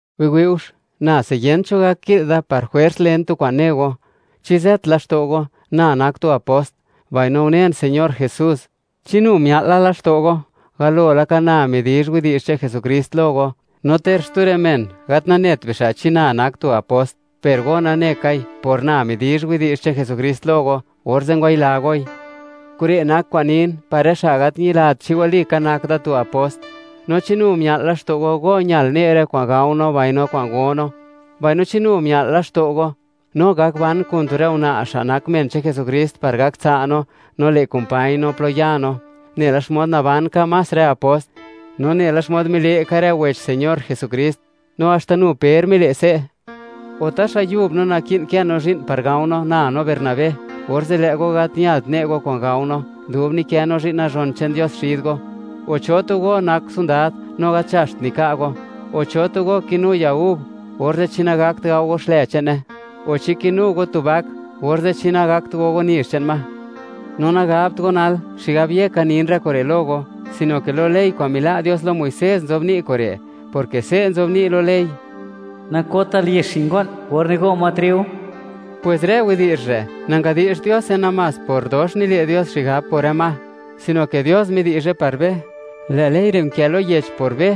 Biwi'ux, nase yent cho gak ki'l da par jwers len tu kwa'n ne go. ¿Chi ze't laxto' go na nak tu apost, mbaino unen Señor Jesús? ¿Chi nu mia'l la laxto' go, galo laka na midizh widi'zh che'n Jesukrist lo go? No ter xtu rë men gat nanet bixa' chi na nak tu apost, per go nane kai, por na midizh widi'zh che'n Jesukrist lo go, orze' ngwayila goi. Kure' nak kwa'n nin, par rë xa' gat ñilat chi walika, nak da tu apost. No, ¿chi nu mia'l laxto' go, go ñal ne' rë kwa'n gao no mbaino kwa'n go no? Mbaino, ¿chi nu mia'l laxto' go, no gak ban kun tu rë una' xa' nak men che'n Jesukrist par gak tsa' no, no le' kumpañ no plo ya no, nela xmod naban ka más rë apost? No nela xmod mile' ka, rë wech Señor Jesukrist, no haxta nu Per mile' se'. O, ¿taxa yub no naki'n kë no zhi'n par gao no, na no Bernabé, orze' lë' go gat ñalt, ne' go kwa'n gao no, dub nikë no zhi'n nazhon che'n Dios xid go? O, ¿cho tu go nak sondad, no gat nzhaxt nika' go? O, ¿cho tu go kinu ya gub, orze' chi nagakt gao go xlë che'ne? O, ¿chi kinu go tu bak, orze' chi nagakt go go nizh che'n ma? No nagabt go nal, xigab yeka nin rë kure' lo go, sino ke lo ley kwa'n mila' Dios lo Muisés nzobni' kure', porke se' nzobni' lo ley: “Nakotal yex xi' ngo'n or nigo' ma triu.” Pwes rë widi'zh re', nangadi'xt Diose namás por dox nile' Dios xigab por rë ma, sino ke Dios midi'zhe par be. Lë' ley re' nkë lo yech por be,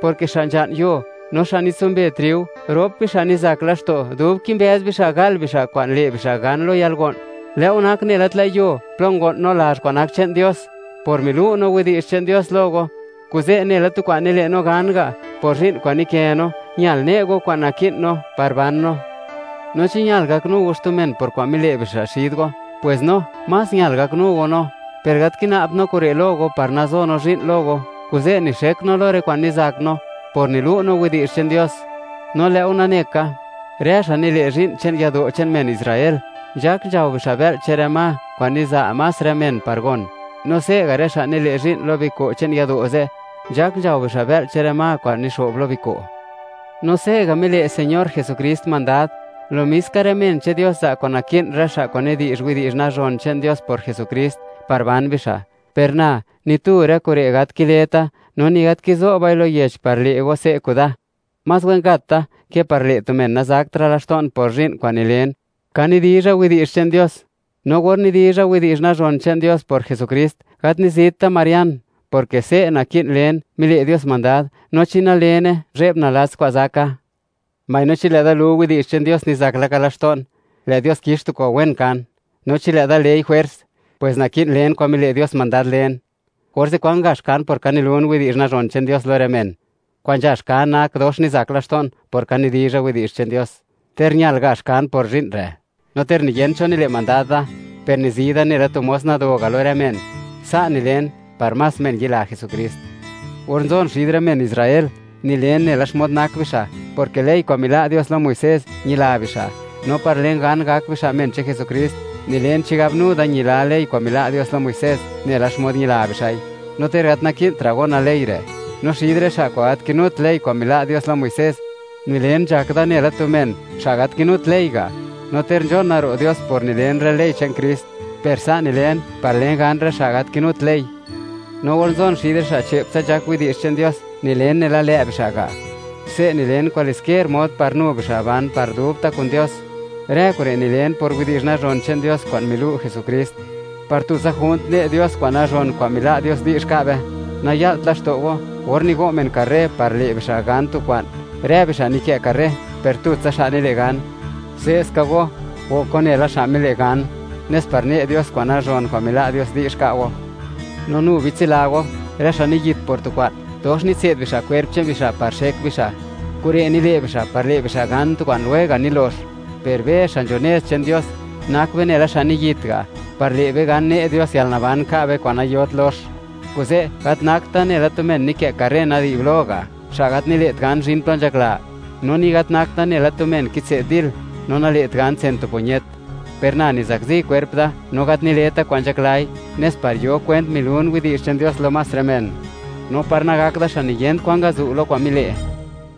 porke xa' nzha'n yuo, no xa' nitsumbe triu, rop bixa' nizak laxto', dub kimbëz bixa', gal bixa' kwa'n le' bixa' gan lo yalgo'n. Lë' go nak nela tlë' yuo plo ngo'n no lazh kwa'n nak che'n Dios, por milu' no widi'zh che'n Dios lo go. Kuze', nela tu kwa'n nile' no gan ga', por zhi'n kwa'n nikë no, ñal ne' go kwa'n naki'n no par ban no. No chi ñal gaknu go xtu men por kwa'n mile' bixa' xid go, pwes no, más ñal gaknu go no. Per gat kina'bt no kure' lo go par nazo no zhi'n lo go, kuze' nixek no lo rë kwa'n nizak no, por nilu' no widi'zh che'n Dios. No lë'go nane ka, rë xa' nile' zhi'n che'n yado' che'n men Israel, nzhak nzhao bixa' bë'l che'n rë ma kwa'n niza' más rë men par gon, no se'ga' rë xa' nile' zhi'n lo biko' che'n yado' ze', nzhak nzhao bixa' bë'l che'n rë ma kwa'n nixo'b lo biko'. No se'ga' mile' Señor Jesukrist mandad, lo mis ka rë men che'n Dios za' kwa'n naki'n rë xa' kwa'n nidi'zh widi'zh nazhon che'n Dios por Jesukrist, par ban bixa'. Per na, ni tu rë kure' gat kileta', no ni gat kizo'bai lo yech par le' go se' kuda; más wen gat da ke par le' tu men nazakra' laxto'n por zhi'n kwa'n nilen, ka nidizha widi'zh che'n Dios. No or nidizha widi'zh nazhon che'n Dios por Jesukrist, gat nizit da marian, porke se' naki'n len, mile' Dios mandad. No chi nalene, ¡zhe'b nalats kwa'n zaka! Mbaino chi lë'da lu widi'zh che'n Dios, nizak laka laxto'n, lë' Dios kix tu kwa'n wen kan; no chi lë'da lei jwers, pwes naki'n len kwa'n mile' Dios mandad len. Orze', ¿kwan gax kan por ka nilun widi'zh nazhon che'n Dios lo rë men? Kwa'n nzhax kan nak dox nizak laxto'n, por ka nidizha widi'zh che'n Dios, ter ñal gax kan por zhi'n re'. No ter niyent cho nile' mandad da, per nizi da nela tu mos nado ga' lo rë men. Sa' nilen par más men yila Jesukrist. Or nzon xid rë men Israel, nilen nela xmod nak bixa', porke ley kwa'n mila' Dios lo Muisés, ñila bixa'. No par len gan, gak bixa' men che'n Jesukrist, nilen chigab nu da ñila ley kwa'n mila' Dios lo Muisés, nela xmod ñila bixa'i, no ter gat naki'ntra' gona ley re'. No xid rë xa' kwa'n gat kinut ley kwa'n mila' Dios lo Muisés, nilen, nzhak da nela tu men, xa' gat kinut ley ga', no ter nzhona ro' Dios por nilen rë ley che'n Krist, per sa' nilen par len gan rë xa', gat kinut ley. No or nzon xid rë xa' che'ptsa nzhak widi'zh che'n Dios, nilen nela lë' bixa' ga'; se' nilen kwaliskier mod par nu bixa' ban par dubta' kun Dios. Rë kure' nilen por widi'zh nazhon che'n Dios kwa'n milu' Jesukrist, par tutsa junt ne' Dios kwa'n nazhon kwa'n mila' Dios di'zh ka' be. Naya'lt laxto' go, or nigo' men karré par le' bixa' gan tu kwa'n, rë bixa' nikë' karré, per tutsa xa' nile' gan. Se'ska go, gok go nela xa' mile' gan, nes par ne' Dios kwa'n nazhon kwa'n mila' Dios di'zh ka' go. No nu bitsila go, rë xa' niyit por tu kwa'n, dox nitse'd bixa' kwerp che'n bixa' par xek bixa'. Kure' nile' bixa' par le' bixa' gan tu kwa'n lwega' nilox, per be xa' nzho nez che'n Dios, nak be nela xa' niyit ga', par le' be gan, ne' Dios yalnaban ka' be, kwa'n nayot lox. Kuze', gat nakt da nela tu men nikë' karré nadi'blo ga', xa' gat nile't gan, zhin plo nzhakla; no ni gat nakt da nela tu men kitse'd dil, no nale't gan tsen tu puñet; per na nizakzi kwerp da, no gat nileta kwa'n nzhaklai, nes par yo kwent milun widi'zh che'n Dios lo más rë men, no par nagakt da xa' niyent kwan ngazu' lo kwa'n mile'.